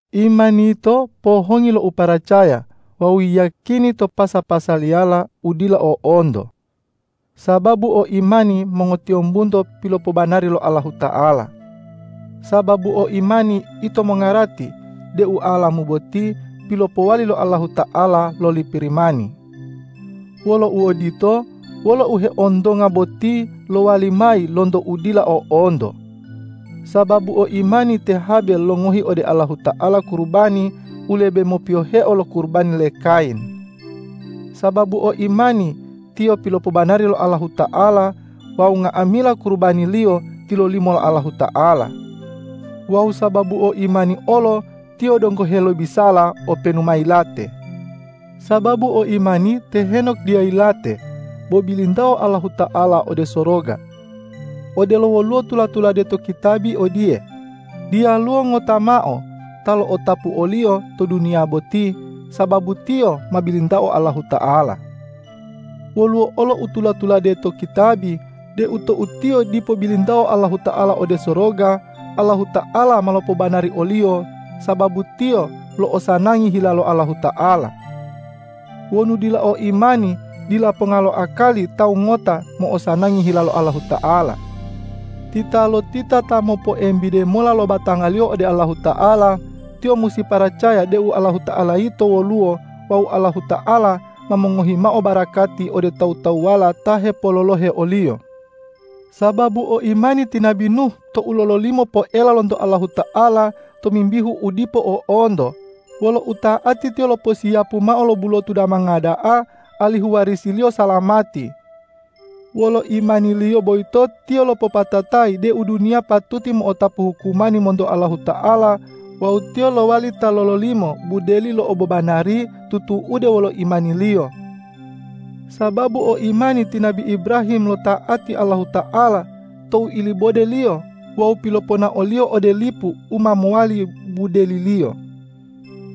Imani yito pohongi lo uparacaya wawu yiyakini to pasa-pasaliyala u dila o'onto. Sababu o imani mongotiyombunto pilopobanari lo Allahuta'ala. Sababu o imani ito mongarati deu alamu boti pilopowali lo Allahuta'ala loli Pirimani. Wolo uodito, wolo u heontonga boti lowali mayi lonto u dila o'onto. Sababu o imani te Habel longohi ode Allahuta'ala kurubani u lebe mopiyoheo lo kurubani le Kayin. Sababu o imani tiyo pilopobanari lo Allahuta'ala wawu nga'amila kurubaniliyo tilolimo lo Allahuta'ala. Wawu sababu o imani olo tiyo donggo helobisala, openu ma yilate. Sababu o imani te Henok dila yilate, bo bilintao Allahuta'ala ode soroga. Odelo woluwo tula-tulade to kitabi odiye,”Diyaluwo ngota mao ta lo'otapu oliyo to duniya boti, sababu tiyo ma bilintao Allahuta'ala.” Woluwo olo u tula-tulade to kitabi deu tou tiyo dipo bilintao Allahuta'ala ode soroga, Allahuta'ala ma lopobanari oliyo, sababu tiyo lo'osanangi hila lo Allahuta'ala. Wonu dila o imani, dila ponga lo akali tawu ngota mo'osanangi hila lo Allahuta'ala. Titalotita ta mopoembide mola lo batangaliyo ode Allahuta'ala, tiyo musi paracaya deu Allahuta'ala yito woluwo wawu Allahuta'ala ma mongohi mao barakati ode tawu-tawuwala ta hepololohe o-Liyo. Sababu o imani ti nabi Nuh tou lololimo poela lonto Allahuta'ala tomimbihu u dipo o'onto, wolo uta'ati tiyo loposiyapu mao lo bulotu damanga da'a alihu warisiliyo salamati. Wolo imaniliyo boyito tiyo lopopatatayi deu duniya patuti mo'otapu hukumani monto Allahuta'ala wawu tiyo lowali ta lololimo budeli lo obobanari tutu'ude wolo imaniliyo. Sababu o imani ti nabi Ibrahim lota'ati Allahuta'ala tou ilibode-Liyo wawu piloponao-Liyo ode lipu u ma mowali budeliliyo.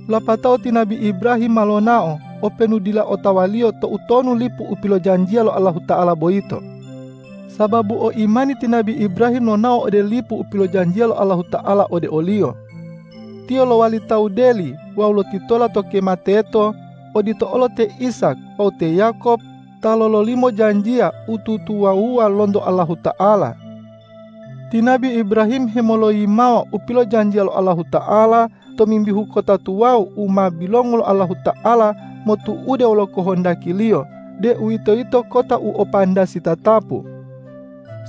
Lapatao ti nabi Ibrahim ma lonao, openu dila otawaliyo toutonu lipu u pilojanjiya lo Allahuta'ala boyito. Sababu o imani ti nabi Ibrahim lonao ode lipu u pilojanjiya lo Allahuta'ala ode oliyo. Tiyo lowali tawu deli wawu lotitola to kema teto, odito olo te Ishak wawu te Yakob ta lololimo janjiya u tutuwawuwa lonto Allahuta'ala. Ti nabi Ibrahim hemoloyimawa u pilojanjiya lo Allahuta'ala tomimbihu kota tuwawu u ma bilongu lo Allahuta'ala motu'ude wolo kohondaki-Liyo, deuwitoyito kota u o pandasi tatapu.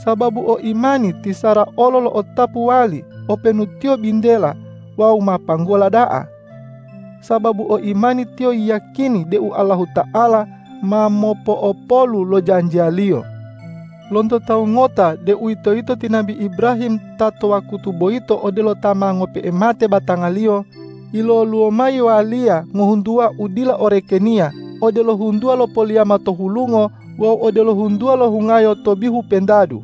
Sababu o imani ti Sara olo lo'otapu wali, openu tiyo bintela wawu ma panggola da'a. Sababu o imani tiyo yiyakini deu Allahuta'ala ma mopo'opolu lo janjiya-Liyo. Lonto tawu ngota, deuwitoyito ti nabi Ibrahim ta to wakutu boyito odelo ta ma ngope'e mate batangaliyo, yiloluwo mayi waliya ngohuntuwa u dila orekeniya, odelo huntuwa lo poliyama to hulungo wawu odelo huntuwa lo hungayo to bihu pentadu.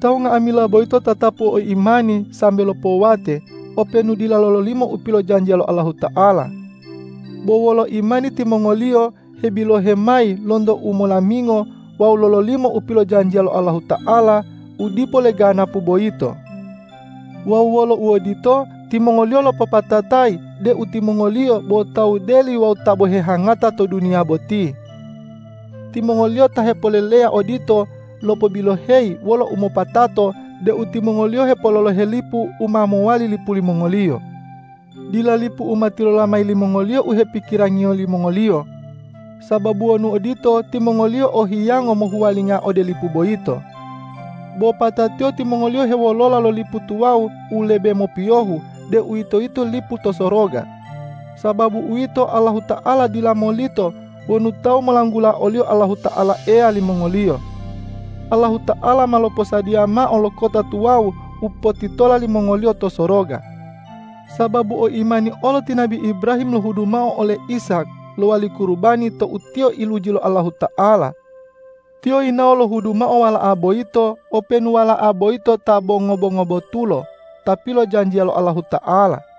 Tawu nga'amila boyito tatapu o imani sambe lopowate, openu dila lololimo u pilojanjiya lo Allahuta'ala. Bo wolo imani timongoliyo hebilohe mayi lonto u molamingo wawu lololimo u pilojanjiya lo Allahuta'ala u dipo leganapu boyito. Wawu wolo uodito, timongoliyo lopopatatayi deu timongoliyo bo tawu deli wawu ta bo hehangata to duniya boti. Timongoliyo ta hepoleleya odito lopobiloheyi wolo umopatato deu timongoliyo hepololohe lipu u ma mowali lipu limongoliyo. Dila lipu u ma tilola mayi limongoliyo u hepikirangiyo limongoliyo. Sababu wonu odito, timongoliyo o hiyango mohuwalinga ode lipu boyito. Bo patatiyo timongoliyo hewolola lo lipu tuwawu u lebe mopiyohu, deuwitoyito lipu to soroga. Sababu uwito, Allahuta'ala dila molito wonu tawu molanggula o-Liyo Allahuta'ala Eya limongoliyo. Allahuta'ala ma loposadiya mao lo kota tuwawu u potitola limongoliyo to soroga. Sababu o imani olo ti nabi Ibrahim lohudu mao ole Ishak lowali kurubani tou tiyo iluji lo Allahuta'ala. Tiyo yinawo lohudu mao wala'a boyito, openu wala'a boyito ta bo ngobo-ngobotulo ta pilojanjiya lo Allahuta'ala.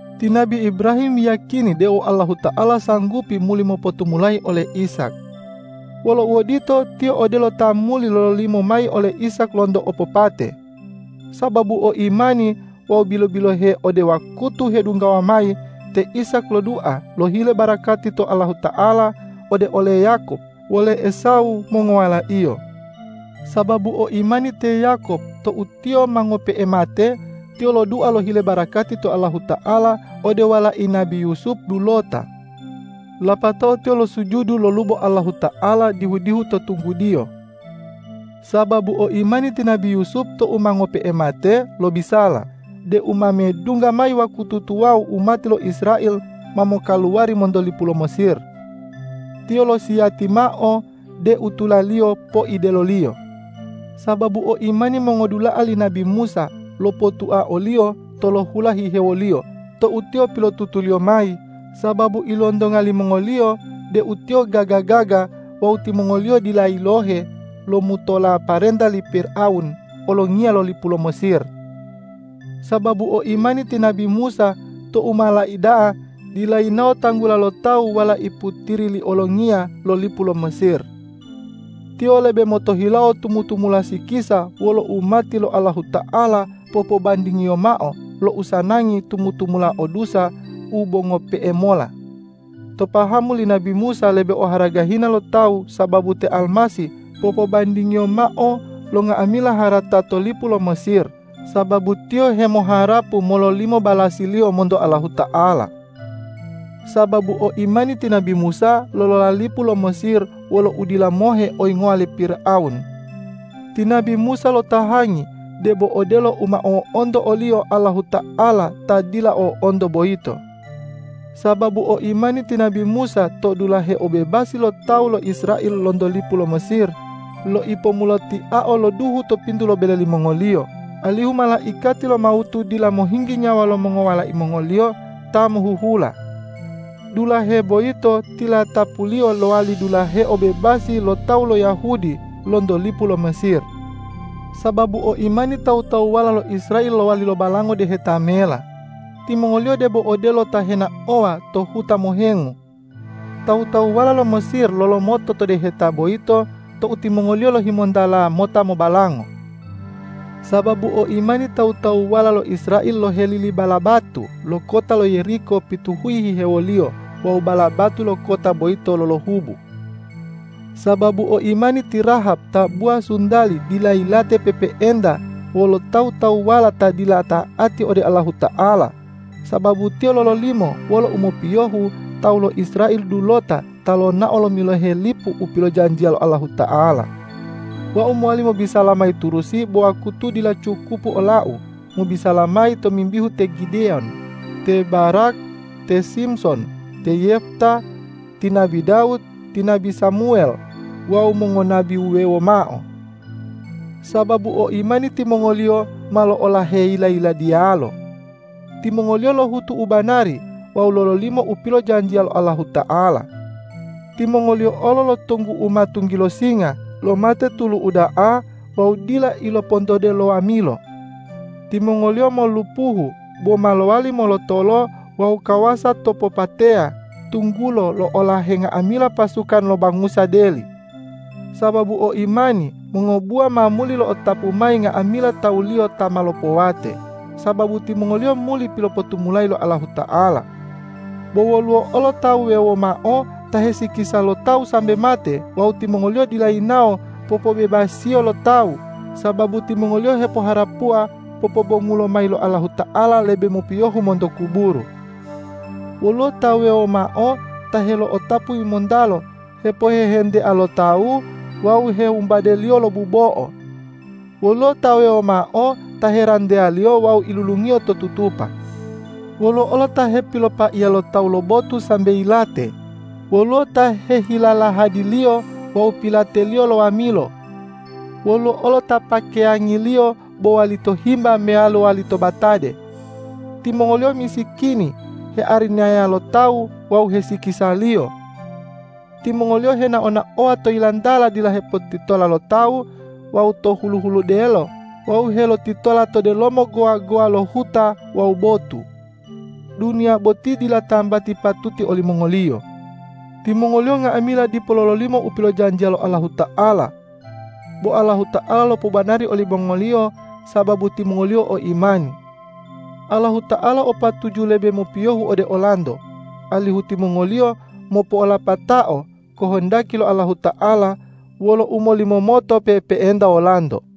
Ti nabi Ibrahim yiyakini deu Allahuta'ala sanggupi muli mopotumulayi ole Ishak. Wolo uodito, tiyo odelo ta muli lololimo mayi ole Ishak lonto opopate. Sababu o imani wawu bilo-bilohe ode wakutu hedunggawa mayi, te Ishak lodua lohile barakati to Allahuta'ala ode ole Yakob wole Esawu mongowalaiyo. Sababu o imani te Yakob tou tiyo ma ngope'e mate, tiyo lodua lohile barakati to Allahuta'ala ode walai nabi Yusup dulota. Lapatao tiyo losujudu lolubo Allahuta'ala dihu-dihu to tunggudiyo. Sababu o imani ti nabi Yusup tou ma ngope'e mate, lobisala deu ma medungga mayi wakutu tuwawu umati lo Israel ma mokaluwari monto lipu lo Mesir. Tiyo losiyati mao deu tulaliyo poideloliyo. Sababu o imani mongodula'a li nabi Musa lopotua oliyo tolohula hihewoliyo tou tiyo pilotutuliyo mayi, sababu ilontonga limongoliyo deu tiyo gaga-gaga wawu timongoliyo dila yilohe lomutola parenta li Pirawun olongiya lo lipu lo Mesir. Sababu o imani ti nabi Musa tou ma laida'a dila yinawo tanggula lo tawu walai putiri li olongiya lo lipu lo Mesir. Tiyo lebe motohilawo tumu-tumula sikisa wolo umati lo Allahuta'ala popobandingiyo mao lo usanangi tumu-tumula o dusa u bo ngope'e mola. To pahamu li nabi Musa lebe oharaga hina lo tawu sababu te Almasih popobandingiyo mao lo nga'amila harata to lipu lo Mesir, sababu tiyo hemoharapu mololimo balasiliyo monto Allahuta'ala. Sababu o imani ti nabi Musa lolola lipu lo Mesir wolo udila mohe oyingowa li Pirawun. Ti nabi Musa lotahangi debo odelo u ma o'onto oliyo Allahuta'ala ta dila o'onto boyito. Sababu o imani ti nabi Musa to dulahe obobebasi lo tawu lo Israel lonto lipu lo Mesir, loipomulotiao lo duhu to pintu lo bele limongoliyo, alihu malaikati lo mawutu dila mohinggi nyawa lo mongowalai mongoliyo ta mohuhula. Dulahe boyito tilatapuliyo lowali dulahe obobebasi lo tawu lo Yahudi lonto lipu lo Mesir. Sababu o imani tawu-tawuwala lo Israel lowali lobalango Deheta Mela; timongoliyo debo odelo ta henaowa to huta mohengu. Tawu-tawuwala lo Mesir lolomoto to deheta boyito tou timongoli lohimontala mota mobalango. Sababu o imani tawu-tawuwala lo Israel lohelili bala batu lo kota lo Yeriko pituhuyi hihewoliyo wawu bala batu lo kota boyito lolohubu. Sababu o imani ti Rahab tabuwa suntali dila yilate pe'epe'enta wolo tawu-tawuwala ta dila ta'ati ode Allahuta'ala, sababu tiyo lololimo wolo umopiyohu tawu lo Israel dulota ta lonao lomilohe lipu u pilojanjiya lo Allahuta'ala. Wau mowali mobisala mayi turusi bo wakutu dila cukupu olau mobisala mayi tomimbihu te Gideyon, te Barak, te Simson, te Yefta, ti nabi Dawud, ti nabi Samuwel wawu mongonabi wuwewo mao. Sababu o imani timongoliyo ma lo'olahe yila-yiladiyalo. Timongoliyo lohutu u banari wawu lololimo u pilojanjiya lo Allahuta'ala. Timongoliyo olo lotonggu'uma tunggilo singa, lomate tulu uda'a wawu dila ilopontode lo wamilo. Timongoliyo molulupuhu bo ma lowali molotolo wawu kawasa to popateya, tunggulo lo'olahe nga'amila pasukan lo bangusa deli. Sababu o imani mongobuwa ma muli lo'otapu mayi nga'amila tawuliyo ta ma lopowate, sababu timongoliyo muli pilopotumulayi lo Allahuta'ala. Bo woluwo olo tawu wuwewo mao ta hesikisa lo tawu sambe mate wawu timongoliyo dila yinawo popobebasiyo lo tawu, sababu timongoliyo hepoharapuwa popobongulo mayi lo Allahuta'ala lebe mopiyohu monto kuburu. Woluwo ta wuwewo mao ta helo'otapu yimontalo hepohehentea lo tawu wawu hewumbadeliyo lo bubo'o. Woluwo ta wuwewo mao ta heranteyaliyo wawu ilulungiyo to tutupa. Woluwo olo ta hepilopaiya lo tawu lo botu sambe yilate, woluwo ta hehilalahadiliyo wawu pilateliyo lo wamilo. Woluwo olo ta pakeyangiliyo bo walito himba meyalo walito batade. Timongoliyo misikini, hearinaya lo tawu wawu hesikisaliyo. Timongoliyo henao-naowa to yilantala dila hepotitola lo tawu wawu to hulu-huludelo wawu helotitola to delomo gowa-gowa lo huta wawu botu. Duniya boti dila tambati patuti olimongoliyo. Timongoliyo nga'amila dipo lololimo u pilojanjiya lo Allahuta'ala. Bo Allahuta'ala lopobanari olimongoliyo sababu timongoliyo o imani. Allahuta'ala o patuju lebe mopiyohu ode olanto, alihu timongoliyo mopo'olapatao kohondaki lo Allahuta'ala wolo umolimomoto pe'epe'enta wolanto.